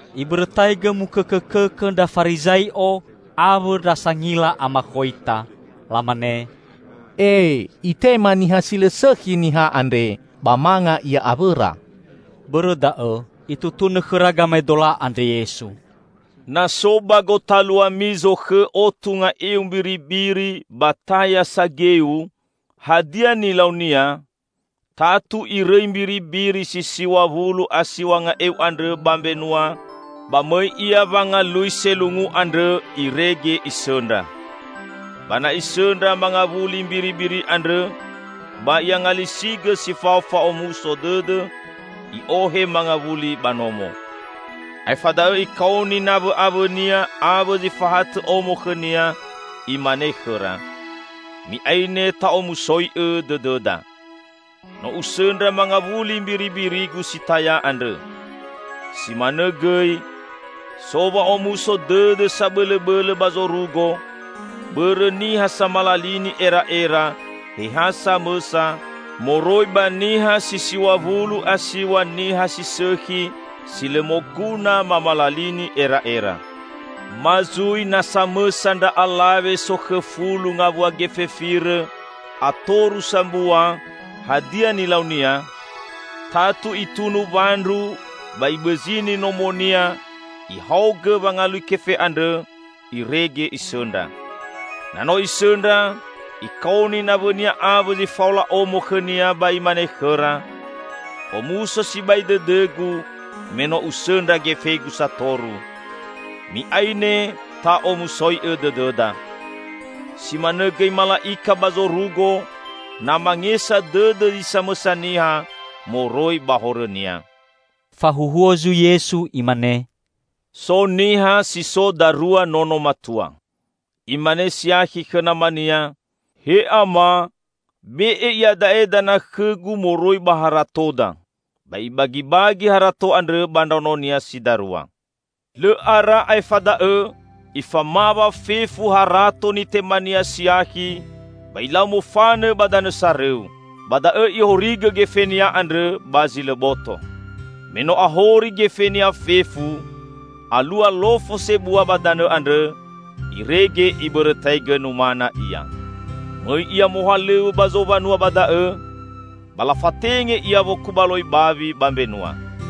Ibõrõtaigõ mukõkõkõkõ ndra Farizai'o awõ ndra sangila amakhoita. Lamane, "E, Itema niha si lõ sõkhi niha andre, ba manga Ia awõra!" Bõrõ da'õ Itutunõ khõra gamaedola andre Yesu, "Na so ba gotaluami zokhõ otu nga'eu mbiribiri ba taya sageu -- hadia nilaunia? Tatu irõi mbiribiri si siw̃a wulu a siw̃a nga'eu andrõ ba mbenua, ba mõi ia wangalui selungu andrõ irege isõndra. Ba na isõndra mangawuli mbiribiri andrõ, ba i'angalisigõ si fao fa'omuso dõdõ, i'ohe mangawuli ba nomo. Aefa da'õ ikaoni nawõ'awõnia awõ zi fahatõ omo khõnia, imane khõra, 'Mi'aine, ta'omusoi'õ dõdõda. No usõndra mangawuli mbiribirigu si taya andrõ!' Si manõ gõi, so wa'omuso dõdõ sabõlõbõlõ ba zorugo bõrõ niha samalalini era'era he ha samõsa, moroi ba niha si siw̃a wulu a siw̃a niha si sõkhi si lõ moguna mamalalini era'era." "Ma zui na samõsa ndra alawe sokhõ fulu ngawua gefe firõ, atoru sambua, hadia nilaunia? Tatu itunu wandru ba ibõzini nomonia, ihaogõ wangalui kefe andrõ irege isõndra. Na no isõndra, ikaoni nawõnia awõ zi faola omo khõnia ba imane khõra, 'Omuso sibai dõdõgu me no usõndra gefegu satoru. Mi'aine, ta'omusoi'õ dõdõda!' Si manõ gõi mala'ika ba zorugo na mangesa dõdõ zi samõsa niha moroi ba horõnia." Fahuhuo zui Yesu, Imane, "So niha si so darua nono matua. Imane siakhi khõ namania, 'He Ama, be'e iada'e dana khõgu moroi ba haratoda.' Ba ibagibagi harato andrõ ba ndraononia si darua. Lõ ara aefa da'õ, ifamawa fefu harato nitemania siakhi ba ilau mofanõ ba danõ sarõu. Ba da'õ ihorigõ gefenia andrõ ba zi lõ boto. Me no ahori gefenia fefu, alua lofo sebua ba danõ andrõ, irege ibõrõtaigõ numana ia. Mõi ia mohalõw̃õ ba zowanua ba da'õ, ba lafatenge ia wokubaloi bawi ba mbenua.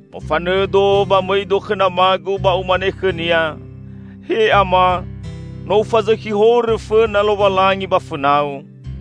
Mofanõdo ba mõido khõ namagu ba umane khõnia: He Ama, no ufazõkhi horõ fõna Lowalangi ba fõnau.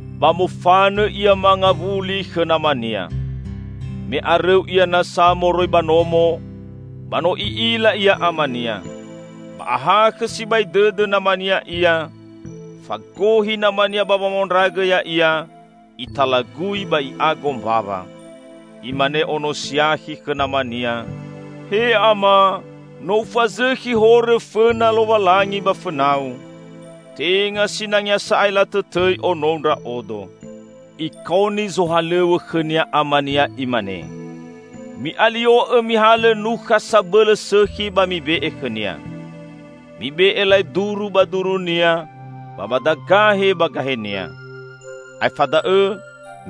Ba mofanõ ia mangawuli khõ namania. Me arõu ia nasa moroi ba nomo, ba no i'ila ia amania. Ba ahakhõ sibai dõdõ namania ia, fagohi namania ba wamaondragõ ya'ia, italagui ba i'ago mbawa. Imane ono siakhi khõ namania, 'He Ama, no ufazõkhi horõ fõna Lowalangi ba fõnau. Tenga sinangea sa'ae latõtõi onou ndra'odo.' Ikaoni zohalõw̃õ khõnia amania imane, 'Mi'alio'õ mihalõ nukha sabõlõ sõkhi ba mibe'e khõnia. Mibe'e laeduru ba durunia ba badagahe ba gahenia. Aefa da'õ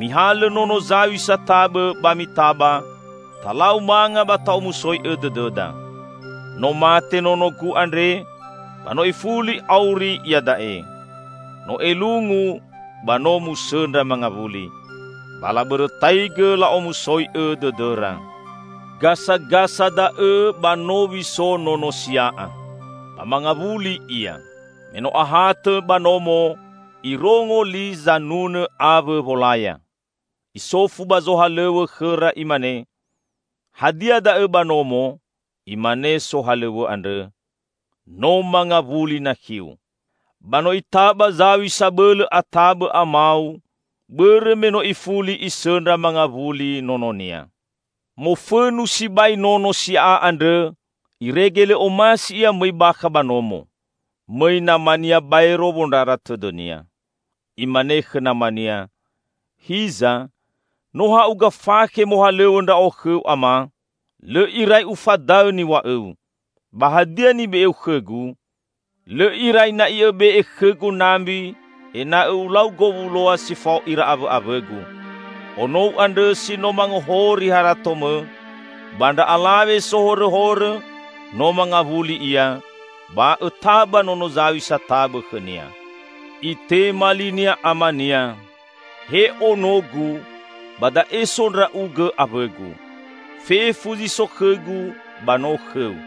mihalõ nono zaw̃i satabõ ba mitaba, talau manga ba ta'omusoi'õ dõdõda. No mate nonogu andre ba no ifuli auri iada'e; no elungu, ba no musõndra mangawuli.' Ba labõrõtaigõ la'omusoi'õ dõdõra. Gasagasa da'õ ba nowi so nono sia'a. Ba mangawuli ia. Me no ahatõ ba nomo, irongo li sanunõ awõ wolaya. Isofu ba zohalõw̃õ khõra, imane, 'Hadia da'õ ba nomo?' Imane sohalõw̃õ andrõ, 'No mangawuli nakhiu! Ba no itaba zaw̃i sabõlõ atabõ amau bõrõ me no ifuli isõndra mangawuli nononia!' Mofõnu sibai nono sia'a andrõ, irege lõ omasi ia mõi bakha ba nomo. Mõi namania baero wondrara tõdõnia. Imane khõ namania, 'Hiza, no ha'uga fakhe mohalõw̃õ ndra'o khõu, Ama. Lõ irai ufadaõ niw̃a'õu. Ba hadia nibe'eu khõgu? Lõ irai na'i õbe'e khõgu nambi ena'õ ulau gowuloa si fao ira awõ'awõgu! Onou andrõ si no mangohori haratomõ ba ndra alawe sohorõhorõ, no mangawuli ia, ba õtaba nono zaw̃i satabõ khõnia!' Itema linia amania, 'He onogu, ba da'e so ndra'ugõ awõgu. Fefu zi so khõgu ba no khõu.